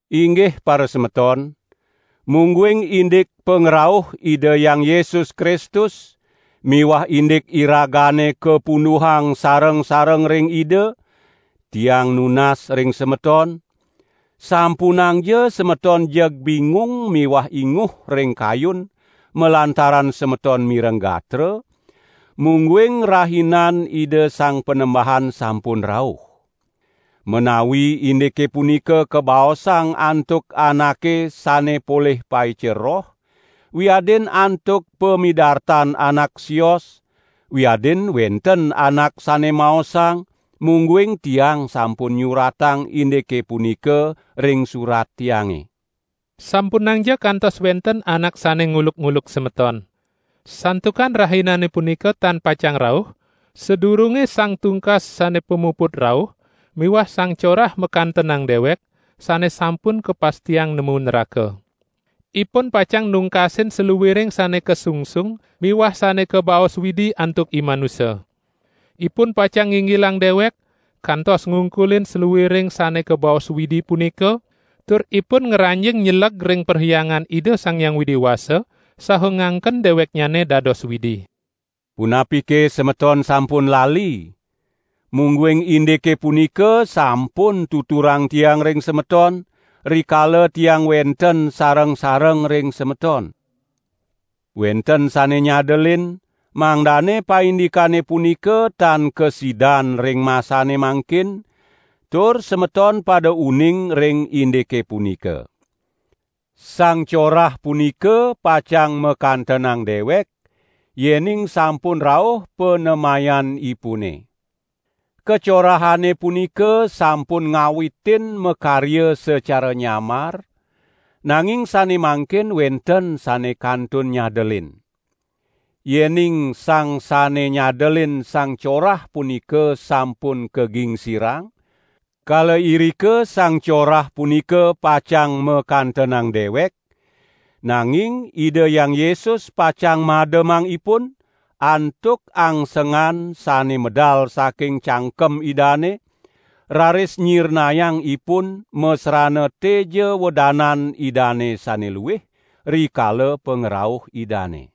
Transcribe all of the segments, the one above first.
Inggih parasemeton, mungguing indik pangrauh Ida Hyang Yesus Kristus miwah indik iragane kapunduhang sareng-sareng ring Ida, tiang nunas ring semeton, sampunangja semeton jeg bingung miwah inguh ring kayun malantaran semeton mireng gatra, mungguing rahinan Ida Sang Panembahan sampun rauh. Menawi indike punika kabaosang antuk anake sane polih paica roh, wiadin antuk pamidartan anak sios, wiadin wenten anak sane maosang mungguing tiang sampun nyuratang indike punika ring surat tiange. Sampunangja kantos wenten anak sane nguluk-uluk semeton. Santukan Rahinane punika tan pacang rauh, sadurunge Sang Tungkas sane pamuput rauh miwah Sang Corah makantenang dewek, sane sampun kapastiang nemu nraka. Ipun pacang nungkasin saluiring sane kasungsung miwah sane kabaos Widi antuk imanusa. Ipun pacang nginggilang dewek kantos ngungkulin saluiring sane kabaos Widi punika, tur ipun ngranjing nyeleg ring Perhyangan Ida Sang Hyang Widi Wasa saha ngangken deweknyane dados Widi. Punapike semeton sampun lali, mungguing indike punika sampun tuturang tiang ring semeton, rikala tiang wenten sareng-sareng ring semeton? Wenten sane nyadelin, mangdane paindikane punika tan kasidan ring masane mangkin, tur semeton pada uning ring indike punika. Sang Corah punika pacang makantenang dewek, yening sampun rauh panemayanipune. Kacorahane punika sampun ngawitin makarya sacara nyamar, nanging sane mangkin wenten sane kantun nyadelin. Yening sang sane nyadelin Sang Corah punika sampun kagingsirang, kala irika Sang Corah punika pacang makantenang dewek, nanging Ida Hyang Yesus pacang mademang ipun, antuk angsengan sane medal saking cangkem Idane, raris nyirnayang ipun masrana teja wedanan Idane sane luih, rikala pangrauh Idane.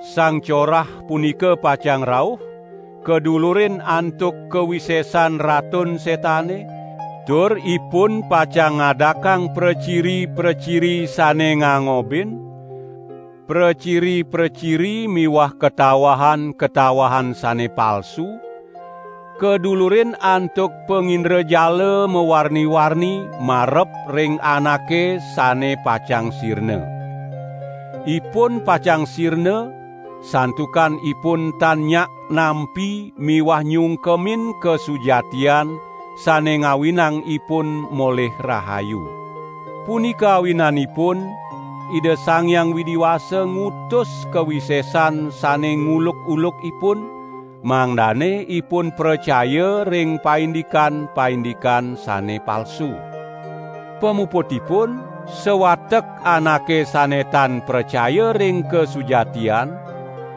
Sang Corah punika pacang rauh kadulurin antuk kawisesan Ratun Setane, tur ipun pacang ngadakang praciri-praciri sane ngangobin, praciri-praciri miwah katawahan-katawahan sane palsu, kadulurin antuk pangindrajala mawarni-warni marep ring anake sane pacang sirna. Ipun pacang sirna, santukan ipun tan nyak nampi miwah nyungkemin kasujatian sane ngawinang ipun molih rahayu. Punika awinanipun Ida Sang Hyang Widi Wasa ngutus kawisesan sane nguluk-uluk ipun, mangdane ipun pracaya ring paindikan-paindikan sane palsu. Pamuputipun sawatek anake sane tan pracaya ring kasujatian,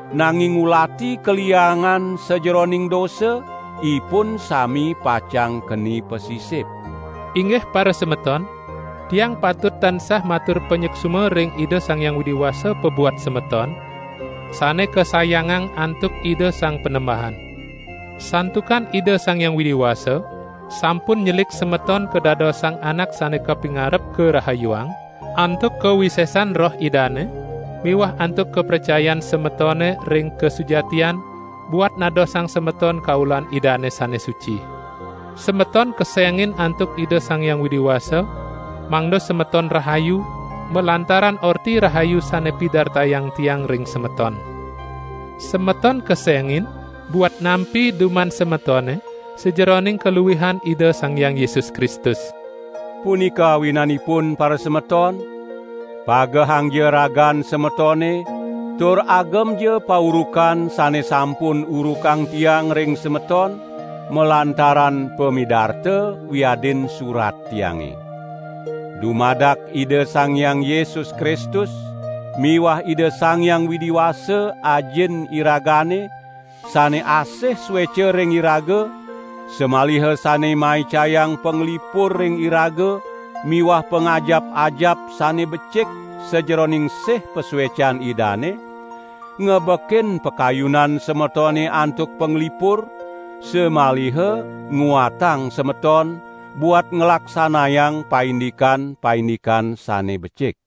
nanging ngulati kaliangan sajeroning dosa, ipun sami pacang keni pasisip. Inggih parasemeton, tiang patut tansah matur panyuksma ring Ida Sang Hyang Widi Wasa pabuat semeton, sane kasayangan antuk Ida Sang Panembahan. Santukan Ida Sang Hyang Widi Wasa sampun nyelik semeton kadadosang anak sane kapingarep karahayuang, antuk kawisesan Roh Idane miwah antuk kapracayan semetone ring kasujatian buat nadosang semeton kaulan Idane sane suci. Semeton kesengin antuk Ida Sang Hyang Widi Wasa mangda semeton rahayu, malantaran Orti Rahayu sane pidartayang tiang ring semeton. Semeton kesengin buat nampi duman semetone sajeroning kaluihan Ida Sang Hyang Yesus Kristus. Punika awinanipun parasemeton, pagehangja ragan semetone tur agemja paurukan sane sampun urukang tiang ring semeton, malantaran pamidarta, wiadin surat tiange. Dumadak Ida Sang Hyang Yesus Kristus miwah Ida Sang Hyang Widi Wasa, Ajin iragane, sane asih sueca ring iraga, samaliha sane maicayang panglipur ring iraga miwah pangajap-ajap sane becik sajeroning sih pasuecan Idane, ngebekin pakayunan semetone antuk panglipur, samaliha nguatang semeton buat nglaksanayang paindikan-paindikan sane becik.